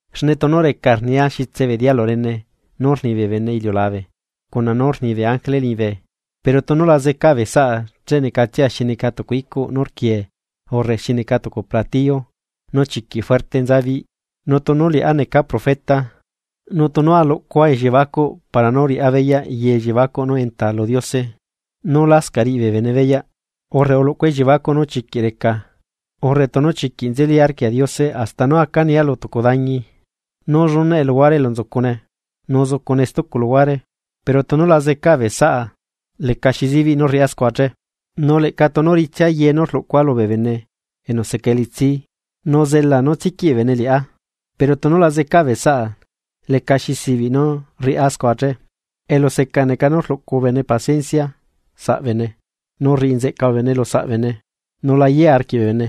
Xne tunu recaa rnia xitse bee dialu rene nú rni bee bene iliulabe cuna nú rni bee ángele liñibe, pero tunu la zeca bee saꞌa che necatsia xi neca tucu icuꞌ nú rquiee urre xi neca tucu platillo nú chiquiꞌ fuerte nza biꞌi. Nu tunu liꞌá neca profeta, nu tunu aluꞌcua elliebacuꞌ para nú riꞌá beyaꞌ ye elliebacuꞌ nú enta lu Diose nú lascaꞌ riꞌi bee bene beyaꞌ, urre aluꞌcua elliebacuꞌ nú chiquiꞌ reca urre tunu chiquiꞌ nzeli arquia Diose hasta nú aca nia lu tucu dañi nú llunaꞌe luhuare elu nzucune, nu zucune stucu luhuare pero tunu la zecaa bee saꞌa lecaxi zibiꞌ nú rriꞌá scua che. Nu leꞌca tunu ritsia ye nú rluꞌcua lubee bene enu seca elitsi nu zelaa nú tsiquiꞌ bee bene liꞌá, pero tunu la zecaa bee saꞌa, lecaxi zibiꞌ nu rriꞌá scua che. Eluseca neca nú rluꞌcu bene paciencia saꞌbene, nu rriꞌi nzeꞌca bene lusaꞌ bene, nu la yea arquiꞌ bee bene,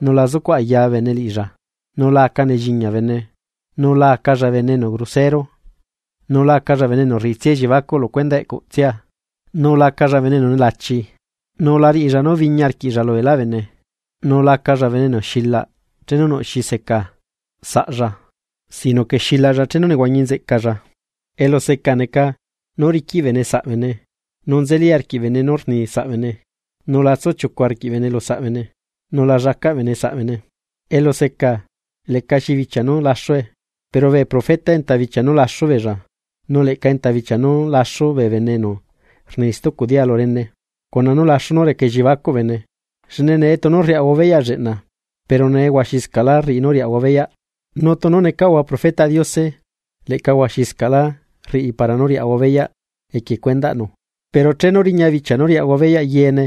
nu la zucuꞌ aya bene liꞌilla, nu la aca nelliñia bene. Nu lacalla bene enu grosero, nu lacalla bene enu rriꞌitsia elliebacuꞌ lu cuendaꞌ eꞌcutsia nu lacalla bene enu nelachi nu la riꞌilla nú biñi arquiꞌlla lubeelá bee bene. Nu lacalla bene enu xilaꞌ chenu nuꞌ xi seca saꞌlla sino que xilaꞌlla chenu nehuañi nzeꞌcalla. Eluseca neca, nú rriquiꞌ bene saꞌbene, nu nzeli arquiꞌ bene nú rni saꞌbene, nu la tsu chiucu arquiꞌ bene lusaꞌ bene, nu la llacaꞌ bene saꞌ bene. Eluseca, lecaxi bichia nú laxue, pero bee profeta enta bichia nú laxu beella nu leꞌca enta bichia nú laxu bee bene enu rni stucu dialu rene, cuna nú laxu nú reca elliebacuꞌ bene. Xne nee tunu rriaꞌahua beyaꞌ lleꞌna, pero huaxiscaꞌlá rriꞌi nú riaꞌahua beyaꞌ nu tunu necaꞌahua profetaꞌ Diose leꞌca huaxiscaꞌlá rriꞌi para nú riaꞌahua beyaꞌ equie cuendaꞌnu. Pero chenu riña bichia nú riaꞌahua beyaꞌ yeene,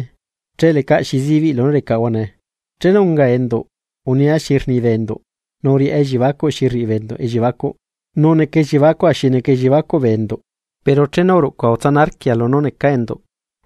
che lecaꞌ xi zibiꞌ lunú recaꞌahua nee. Chenu ungaa enduꞌ unia xi rni bee enduꞌ nu uriꞌá elliebacuꞌ xi rriꞌi bee enduꞌ elliebacuꞌ, nu neca elliebacua xi neca elliebacuꞌ bee enduꞌ. Pero chenu uruꞌcua utsana arquia lunú necaa enduꞌ.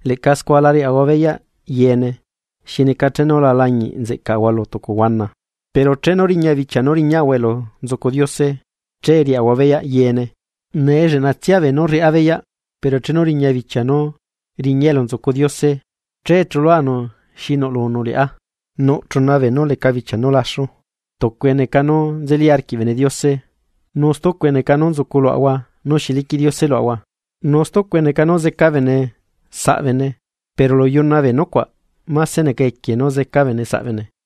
Leꞌca scua la riaꞌahua beyaꞌ yeene, xi neca chenu la lañiꞌ nzeꞌcaꞌahua lu tucu huana, pero chenu riña bichia nú riñaꞌahua elu nzucu Diose che riaꞌahua beyaꞌ yeene. Nee lleꞌnatsia beenú rriꞌá beyaꞌ pero chenu riña bichia nú riñaa elu nzucu Diose che chuluanu xi nuꞌlunu liꞌá. Nuꞌ chuna beenú leca bichia nú laxu: Tucue neca nú nzeli arquiꞌ bene Diose, nu stucue neca nú nzucu luaꞌahua nú xi liquiꞌ Diose luaꞌahua, nu stucue neca nú seca bene saꞌbene, pero lu yuna bee nucuaꞌ máse neca equie nú seca bene saꞌbene.